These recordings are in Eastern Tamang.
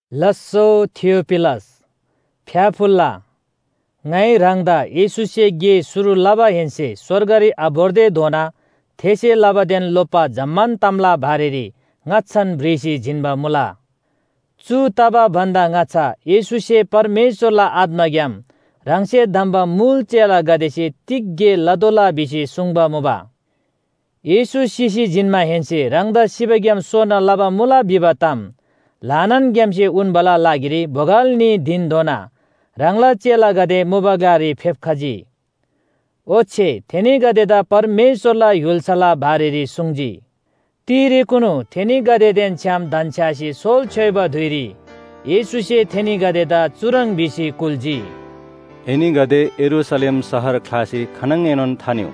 लास्‍सो, थियोफिलस, फ्‍याफुल्‍ला, ङाइ ह्राङदा येशूसे गे शुरु लबाहेन्‍से स्‍वर्गरी आभोर्तेधोना थेसे लबादेन लोप्‍बा जम्‍मान तामला बारेरी ङाच्‍छान भ्रिसी जिन्‍बा मुला। चु तबा भन्‍दा ङाच्‍छा येशूसे परमेश्‍वरला आत्‍माग्‍याम ह्राङसे धम्‍बा मुल चेलागदेसे तिग गे लतोःला भिसी सुङ्बा मुबा। येशू सिसी जिन्‍माहेन्‍से ह्राङदा सिबाग्‍याम सोना लबा मुला भिबा ताम ल्‍हानान ग्‍यामसे उन्‍बाला लागिरी बोगल न्‍ही धिनधोना ह्राङला चेलागदे मुबा ग्‍लारी फेप्‍खजी। ओच्‍छे थेनीगदेदा परमेश्‍वरला य्‍हुल्‍साला बारेरी सुङ्जी। तिरेकुनु थेनीगदेदेन छ्‌याम धन्‍छ्‌यासी सोल छ्‌योइबा धुइरी येशूसे थेनीगदेदा चुह्रङ् भिसी कुल्‍जी, “एनीगदे यरूशलेम शहर ख्‍लासी खानङएनोन थानिउ।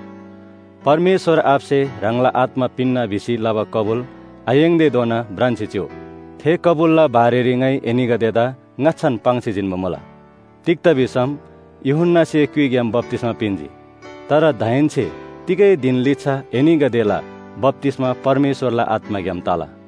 परमेश्‍वर आबासे ह्राङला आत्‍मा पिन्‍ना भिसी लबा कबुल आयाङ्‌तेधोना भ्रान्‍सी चिउ। थे कबुलला बारेरी ङाइ एनीगदेदा ङाच्‍छान पाङ्सी जिन्‍बा मुला। तिग्‍दा भिसम यूहन्‍नासे क्‍युइग्‍याम बप्‍तिस्‍मा पिन्‍जी, तर दाहेन्‍से तिगै धिन लिच्‍छा एनीगदेला बप्‍तिस्‍मा परमेश्‍वरला आत्‍माग्‍याम तला।”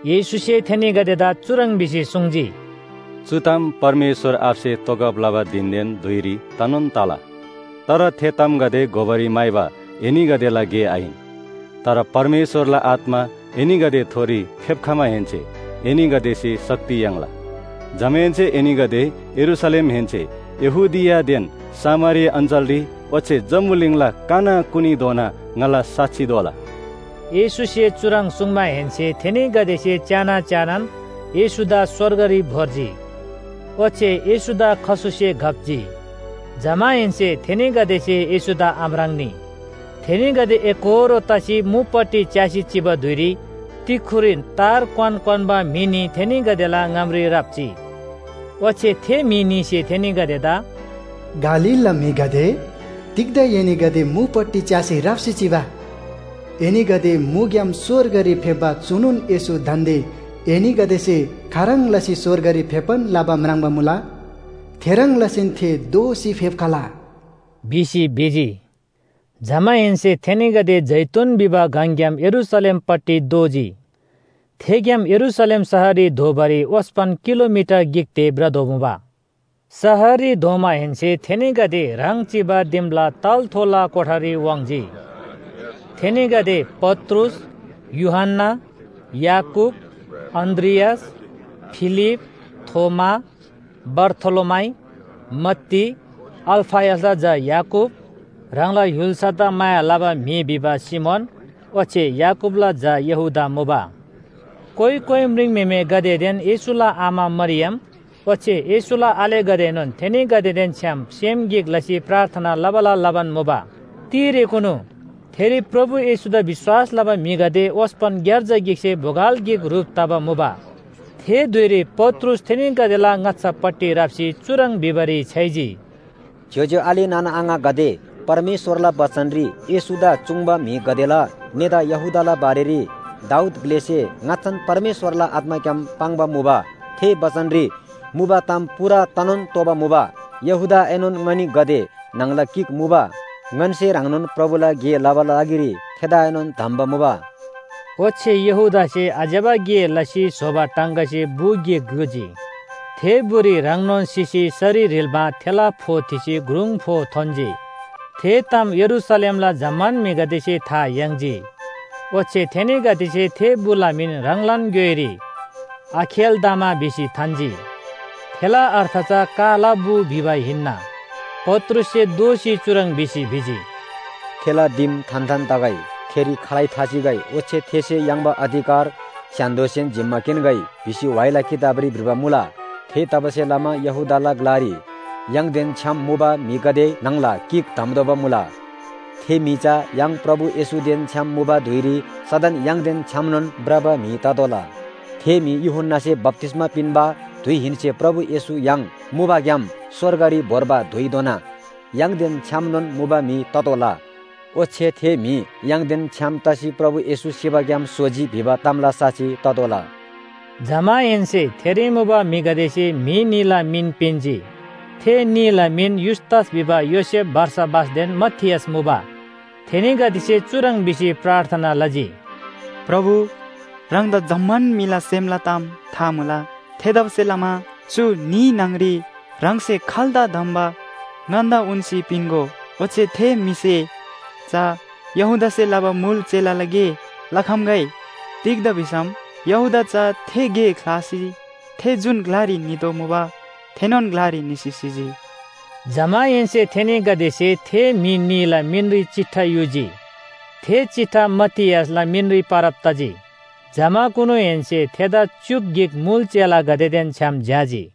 येशूसे थेनीगदेदा चुह्रङ् भिसी सुङ्जी, “चु ताम परमेश्‍वर आबासे तोगब लबा धिनदेन धुइगदेरी तनोन तला। तर थे तामगदे घोबारी म्‍हाइबा एनीगदेला गे आहिन। तर परमेश्‍वरला आत्‍मा एनीगदेथोरी फेप्‍खमाहेन्‍से एनीगदेसे शक्ति याङ्ला। जमाहेन्‍से एनीगदे यरूशलेमहेन्‍से यहूदियादेन सामरिया अञ्‍चलरी, ओच्‍छे जम्‍बुलिङला कनाकुनीधोना ङाला साक्षी दोला।” येशूसे चुह्रङ् सुङ्माहेन्‍से थेनीगदेसे च्‍याना च्‍यानान येशूदा स्‍वर्गरी भोर्जी। ओच्‍छे येशूदा खसुसे घप्‍जी। जमाहेन्‍से थेनीगदेसे येशूदा आम्राङ्‌नी। थेनीगदे एकोहोरो तसी मुपट्टि च्‍यासी चिबा धुइरी तिक्‍खुरीन तार क्‍वान क्‍वान्‍बा म्‍हि न्‍ही थेनीगदेला ङामरी राप्‍जी। ओच्‍छे थे म्‍हि न्‍हीसे थेनीगदेदा “गालीलला म्‍हिगदे, तिग्‍दा एनीगदे मुपट्टि च्‍यासी राप्‍सी चिबा? एनीगदे मुबाग्‍याम स्‍वर्गरी फेप्‍बा चुनोन येशू दान्‍दे एनीगदेसे खाह्रङ् लसी स्‍वर्गरी फेप्‍बान लबा म्राङ्बा मुला। थेह्रङ् लसीन थे दोःसी फेप्‍खला” भिसी भिजी। जमाहेन्‍से थेनीगदे जैतून भिबा गङग्‍याम यरूशलेमपट्टि दोःजी। थेग्‍याम यरूशलेम शहररी धोबारी ओस्‍पन किलोमिटर गिक ते भ्रदोमुबा। शहररी धोमाहेन्‍से थेनीगदे ह्राङ चिबा दिमला तलाथोला कोठारी वाङ्‌जी। थेनीगदे पत्रुस, यूहन्‍ना, याकूब, अन्‍द्रियास, फिलिप, थोमा, बारथोलोमाइ, मत्ती, अल्‍फयसला झा याकूब, ह्राङला य्‍हुल्‍सादा माया लबा म्‍हि भिबा सिमोन ओच्‍छे याकूबला झा यहूदा मुबा। कोइ कोइ म्रिङम्‍हेमेगदेदेन येशूला आमा मरियम ओच्‍छे येशूला आलेगदेएनोन थेनीगदेदेन छ्‌याम सेम गिक लसी प्रार्थना लबाला लबान मुबा। तिरेकुनु थेरी प्रभु येशूदा विश्‍वास लबा म्‍हिगदे ओस्‍पन ग्‍यार्जा गिकसे बोगल गिक ह्रुप तबा मुबा। थे धुइरी पत्रुस थेनीगदेला ङाच्‍छापट्टि राप्‍सी चुह्रङ् भिबारी छ्‌याइजी, “ज्‍योज्‍यो आले नाना आङागदे, परमेश्‍वरला बचनरी येशूदा चुङ्बा म्‍हिगदेला नेता यहूदाला बारेरी दाऊद ग्‍लेसे ङाच्‍छान परमेश्‍वरला आत्‍माग्‍याम पाङ्बा मुबा। थे बचनरी मुबा ताम पूरा तनोन तोःबा मुबा। यहूदाएनोन ङनीगदे न्‍हङला गिक मुबा। ङन्‍से ह्रङ्नोन प्रभुला गे लबाला लागिरी थेदाएनोन धम्‍बा मुबा।” ओच्‍छे यहूदासे आज्‍यबा गे लसी स्‍होबा टाङगासे बु गिक ग्‍लुजी। थे बुरी ह्राङनोन सिसी सरी ह्रिल्‍मा थेला फो थिसी ग्रुङ फो थोन्‍जी। थे ताम यरूशलेमला जम्‍मान म्‍हिगदेसे था याङ्जी, ओच्‍छे थेनीगदेसे थे बुला मिन ह्राङलान ग्‍योइरी “आखेल्‍दामा” भिसी थान्‍जी। थेला अर्थ चा काला बु भिबा हिन्‍ना। पत्रुससे दोःसी चुह्रङ् भिसी भिजी, “‘थेला दिम थान्‍थान तगै, थेरी खालै थाचिगै।’ ओच्‍छे ‘थेसे याङ्बा अधिकार स्‍य्‍हान्‍दोसेन जिम्‍मा किन्‍गै’ भिसी व्‍हाइला किताबरी भ्रिबा मुला। “थेतबासेलमा यहूदाला ग्‍लारी य्‍हाङदेन छ्‌याम मुबा म्‍हिगदे न्‍हङला गिक धम्‍तोःबा मुला। थे म्‍हि चा य्‍हाङ प्रभु येशूदेन छ्‌याम मुबा धुइरी सदन य्‍हाङदेन छ्‌यामनोन भ्रबा म्‍हि ततोःला। थे म्‍हि यूहन्‍नासे बप्‍तिस्‍मा पिन्‍बा धुइहेन्‍से प्रभु येशू य्‍हाङ मुबाग्‍याम स्‍वर्गरी भोर्बा धुइधोना य्‍हाङदेन छ्‌यामनोन मुबा म्‍हि ततोःला। ओच्‍छे थे म्‍हि य्‍हाङदेन छ्‌याम तसी प्रभु येशू सिबाग्‍याम सोजी भिबा तामला साक्षी ततोःला।” जमाहेन्‍से थेरी मुबा म्‍हिगदेसे म्‍हि न्‍हीला मिन पिन्‍जी। थे न्‍हीला मिन युस्‍तस भिबा योसेफ बारसाबासदेन मतियास मुबा। थेनीगदेसे चुह्रङ् भिसी प्रार्थना लजी, “प्रभु, ह्राङदा जम्‍मान म्‍हिला सेमला ताम था मुला। थेतबासेलमा चु न्‍ही न्‍हङरी ह्राङसे खाल्‍दा धम्‍बा, ङन्‍दा उन्‍सी पिन्‍गो। ओच्‍छे थे म्‍हिसे चा यहूदासे लबा मुल चेलाला गे लखम्‍गै। तिग्‍दा भिसम यहूदा चा थे गे ख्‍लासी थे जुन ग्‍लारी नितोःमुबा थेनोन ग्‍लारी निसी सिजी।” जमाहेन्‍से थेनीगदेसे थे म्‍हि न्‍हीला मिनरी चिट्ठा युजी, थे चिट्ठा मतियासला मिनरी परब तजी। जमाकुनुहेन्‍से थेदा च्‍युक गिक मुल चेलागदेदेन छ्‌याम झ्‍याजी।